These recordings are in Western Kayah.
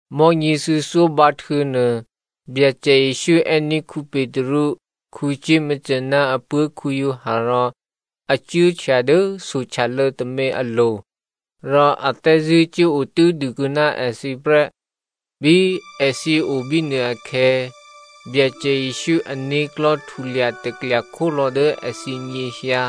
Mò̤́nyě thuô̌thyó bǎhtuô̌nuô Byacè Jesǔ è́ní̤ Petru, Jakomo ná apuố̤ Giovanni rò a cuốhtya dố sohtyalô̌ tômě alo̤. Rò a thè́zṳ̂́ cuốotû́dû kuô̌ná èthǐ prè́. Bí èthǐ o bínuôakhè̌ Byacè Jesǔ ané̤klò̤́ htulya taklya khólò̌ dố èthǐ nyěhyǎ.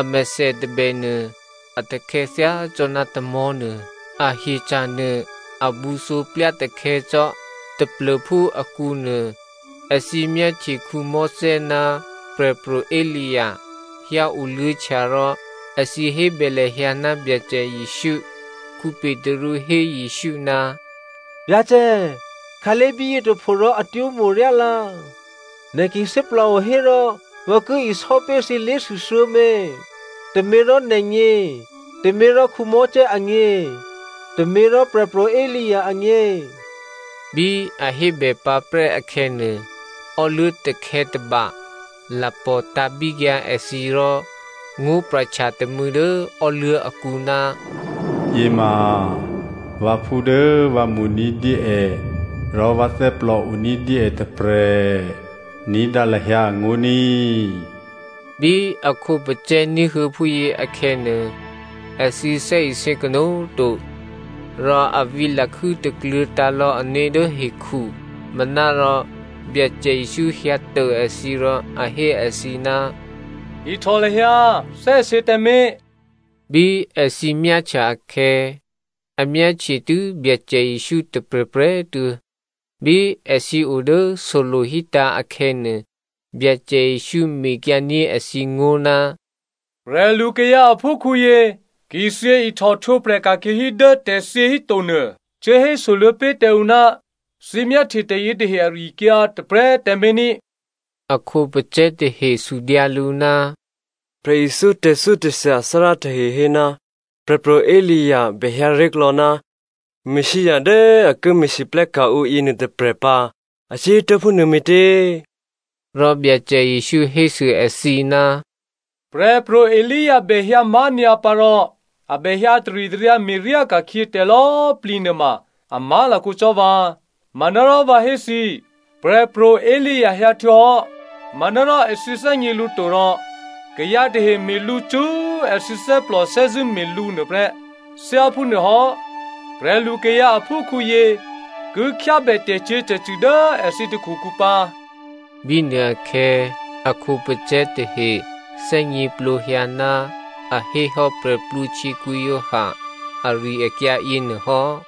Amèthè tôbè nuô a takhè̌ thyácò́ná tamò̤́nuô, ahyeca̤ nuô a bǔthǒ plyatakhè̌ cò́. Taplô̤phú akǔnuô, èthǐ myáhtye Mosè ná Prè̤pro̤ Elia hyǎoluô̌htya rò èthǐ hébè lahyǎ ná Byacè Jesǔ. Petru hé Jesǔ, “Byacè꤮, khǎlé̤ bíyě tôpho rò atwó̤ mo̤ryá lǎ. Nè̤ ki thè́plòo hérò vǎ ki isò́pé̤ thǐ lé̤thû thuô̌mě, tôměrò nè̤gně, tôměrò Mosè agně, tôměrò Prè̤pro̤ Elia agně.” Bí a hébè pǎprè́ akhè̌nuô, ò́luố̤ takhè̌ tôba lapò̤ tǎ̤bíkyǎ èthǐ rò ngó̤pra̤htya tômû̌ dố ò́luố̤ akǔ, “Yěma vǎphú dố vǎ mo̤ ní̤dyé è rò vǎ thè́plòo ní̤dyé è tôprè̤, ní̤dǎ lahyǎ angó̤ ní꤮.” Bí a khǒpacè̤̌ ní̤huô̌ phúyě akhè̌nuô, èthǐ thè́isě kanó̤꤮ to, rò a vǐ lakhû́ takluô̤̌ tǎ̤lò̌ ané̤ dố hekhu. Manárò, Byacè Jesǔ hyǎ tô èthǐ rò a hé èthǐ, “Ihtò lahyǎ, thè́isě tǎmé̤.” Bí èthǐ myáhtya akhè̌, a myáhtye tû́ Byacè Jesǔ tôprè̤prè̤꤮ tuô̌. Bí èthǐ o dố solo̤ hítǎ̤ akhè̌nuô, Byacè Jesǔ mekyǎ ní̤ èthǐ ngó̤, “Prè̤lukayǎ aphúkhǔyě ki thyě ihtòhtwǒprè̤ ka̤khyě hí dố tè̤thyě hítonuô, cuố hésoluô̌ pé̤ tǎ ǔ ná thǐ myáhtye tè̤yětahe ari-akyǎ tôprè̤꤮ tǎmé̤ ní꤮.” A khǒpacè̤̌ tahe sudyǎ lǔ, “Prè̤ithyó tè̤thyótè̤thya athárá tahe hé ná Prè̤pro̤ Elia bèhyǎ ré̤klò̌ ná Messia dố a ki me̤lwóhteka̤ ǔ yěnuô tôprè̤ pǎ, a cuốhétuố̤ phúnuô me̤tě?” Rò Byacè Jesǔ hésû èthǐ, “Prè̤pro̤ Elia bè hyǎ má̤nyǎ pǎ rò a bè hyǎ taritaryǎ me̤ryá ka̤khyě tè̤lò̌꤮ plǐ nuôma a má̤lakǒ cò́ vǎ. Manárò vǎ hé thǐ, Prè̤pro̤ Elia hyǎ htuô̌hò́ manárò èthǐ thè́gně lǔ to rò kayǎ tahe me̤ lǔ cṳ́꤮ èthǐ thè́plò thè́zṳ̂́ me̤ lǔ nuôprè́. Thyáphúnuôhò́, prè̤lukayǎ aphúkhǔyě ki khyábè tè̤cyě̤tè̤cṳ̂ dố èthǐ takhukǔ pǎ.” Bínuôakhè̌ a khǒpacè̤̌ tahe thè́gněplǒhyǎ ná a hé hò́ Giovanni Baptista ari-akyǎ yěnuô hò́.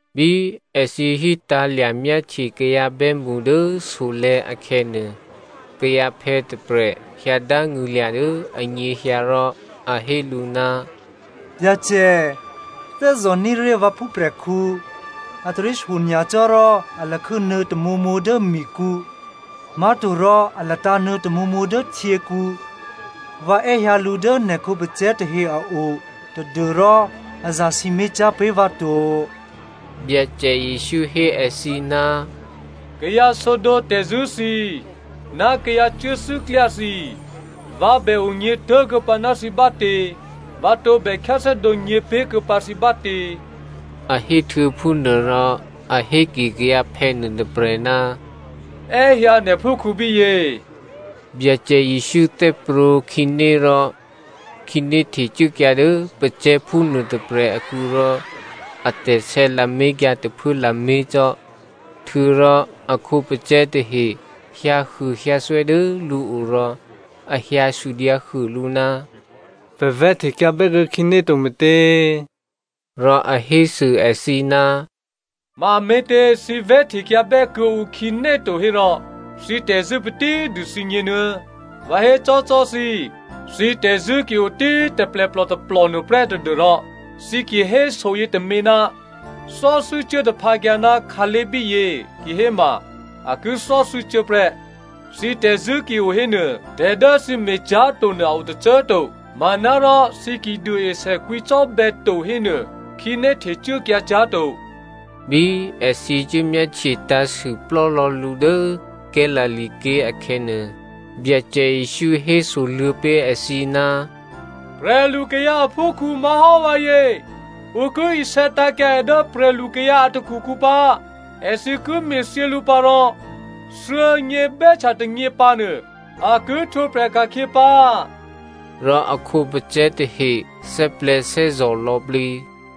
Bí èthǐ hítǎ̤lya̤ myáhtye kayǎ bè́mṳ dố solè̤̌ akhè̌nuô, kayǎphè̌ tôprè̤ hyǎ dángṳ̂lya̤ dố anyěhyǎ rò a hé lǔ, “Byacè, thè́zò̤ní̤ ré̤ vǎ phúprè̤khǔ, a taryé shyonyacò́ rò a lakhû́ nuô̌ tamǒmǒ dố mikǔ, má̤torò a latǎ̤nuô̌ tamǒmǒ dố htyěkǔ. Vǎ è́hyǎ lǔ dố nè̤ khǒpacè̤̌ tahe a o tadû́rò a zasǐmé̤cyá̤ pé̤ vǎ to.” Byacè Jesǔ hé èthǐ, “Kayǎ sǒdǒ tè̤zṳ̂́ thǐ꤮, ná kayǎ cuốthû́klyá thǐ꤮, vǎ bè onyě̤ tố̤kuô̌pǎ ná thǐ bátě? Vǎ tǒbè khyáthè́dǒ nyě̤pé̤kuô̌pǎ thǐ bátě?” A héhtuô̌ phúnuôrò a héke kayǎphè̌ nuôtôprè̤, “È́hyǎ nè̤phúkhǔ bíyě.” Byacè Jesǔ thè́prwǒ̤ khǐné rò khǐné htecuốkyǎ dố pacè̤̌phú nuô tôprè̤ akǔ rò atè̤sè̌ lamé̤kyǎ tôphuố lamé̤ cò́. Htuô̌rò a khǒpacè̤̌ tahe hyǎhuôhyǎthwè́ dố lǔo rò a hyǎ sudyǎhuô lǔ, “Pè̤ vè̤́htekyǎ bè́kuô̌ khǐné to me̤tě?” Rò a hésû èthǐ, “Mame̤tě thǐ vè̤́htekyǎbè́ kuô̌ǔ khǐné to hérò, thǐ tè̤zṳ̂́ patí dû thǐgněnuô̌. Vǎ hécò́cò́ thǐ꤮, thǐ tè̤zṳ̂́ ki o tí꤮ taplèplò tôplò nuôprè́ tadû́rò thǐ ki hé soyětômě, ‘Thò́thû́ cuố taphǎkyǎ ná khǎlé̤ bíyě,’ kihéma꤮ a ki thò́thû́cuố prè́. Thǐ tè̤zṳ̂́ ki o hénuô, tè̤ dố thǐ me̤cyá̤to nuô a o tôcô꤮ to. (Manárò, thǐ ki duôesè kwǐcò́bè̌ to hénuô, khǐné htecuốkyǎ cyá̤ to.)” Bí èthǐ cuố myáhtye tǎ̤sû plò́lò̌ lǔ dố Galilea ké̤ akhè̌nuô, Byacè Jesǔ hésoluô̌ pé̤ èthǐ, “Prè̤lukayǎ aphúkhǔ má̤hò́ vǎyě, ǔ ki isè̌ tǎ̤kyǎ è dố prè̤lukayǎ a takhukǔ pǎ. Èthǐ ki me̤thyě lǔ pǎ rò thuô̌nyě bè́htya tônyě pǎnuô a ki htwǒprè̤ ka̤khyě pǎ.” Rò a khǒpacè̤̌ tahe thè́plè̤̌thè́zò̤ lò̌plǐ.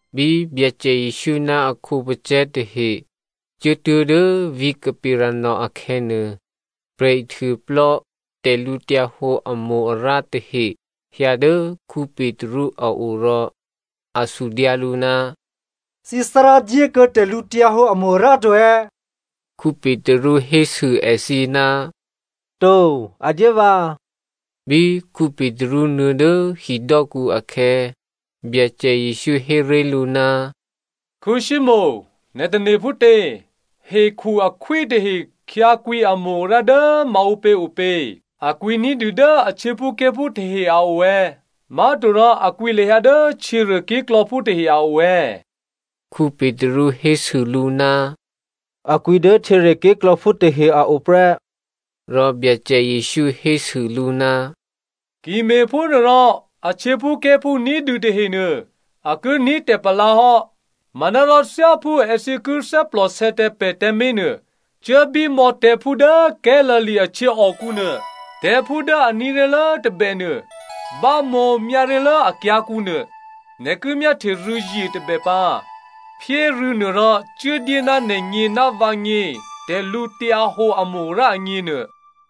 Bí Byacè Jesǔ ná a khǒpacè̤̌ tahe cuốtuố̤ dố vǐ̤ Capernaum akhè̌nuô, prè̤ihtuôplò́ tè̤lǔhǒdu amo-arǎ tahe hyǎ dố Petru a o rò a sudyǎ lǔ, “Thǐthárá dyékuô̌ tè̤lǔhǒdu amo-arǎ to è̌?” Petru hésû èthǐ, “To, a dyé vǎ꤮” Bí Petru nuô̌ dố hidò́kǔ akhè̌, Byacè Jesǔ hé ré̤ lǔ, “Simonè, nè̤ tane̤ phútě? Hekhu akhwí tahe a hyǎkwǐ amo-arǎ dố maǔpě opě? A kwǐ ní̤dû dố a htyěphúké̤phú tahe a o è̌? Má̤torò a kwǐ lahyǎ dố htyěruô ké̤klò̌phú tahe a o è̌?” Petru hésû lǔ, “A kwǐ dố htyěruô ké̤klò̌phú tahe a o prè́.” Rò Byacè Jesǔ hésû lǔ, “Ki me̤phúnuôrò a htyěphúké̤phú ní̤dû tahenuô, a ki ní̤ tè̤palǎ hò́. Manárò thyáphú èthǐ ki thè́plòsè̌ tǎ pè̤ tǎmé̤ nuô, cuốbímò̌ tè̤̌phú dố Galilea a htyěòkǔ nuô. Tè̤̌phú dố a ní̤ ré̤lố tôbènuô bámǒ myáré̤lố akyǎ̤kǔ nuô. Nè̤ ki myáhtye rû̌zye tôbè pǎ. Phyé rû̌nuô rò cuốdyé ná nè̤gně ná vǎgně tè̤lǔhǒdu amo-arǎ agně nuô.”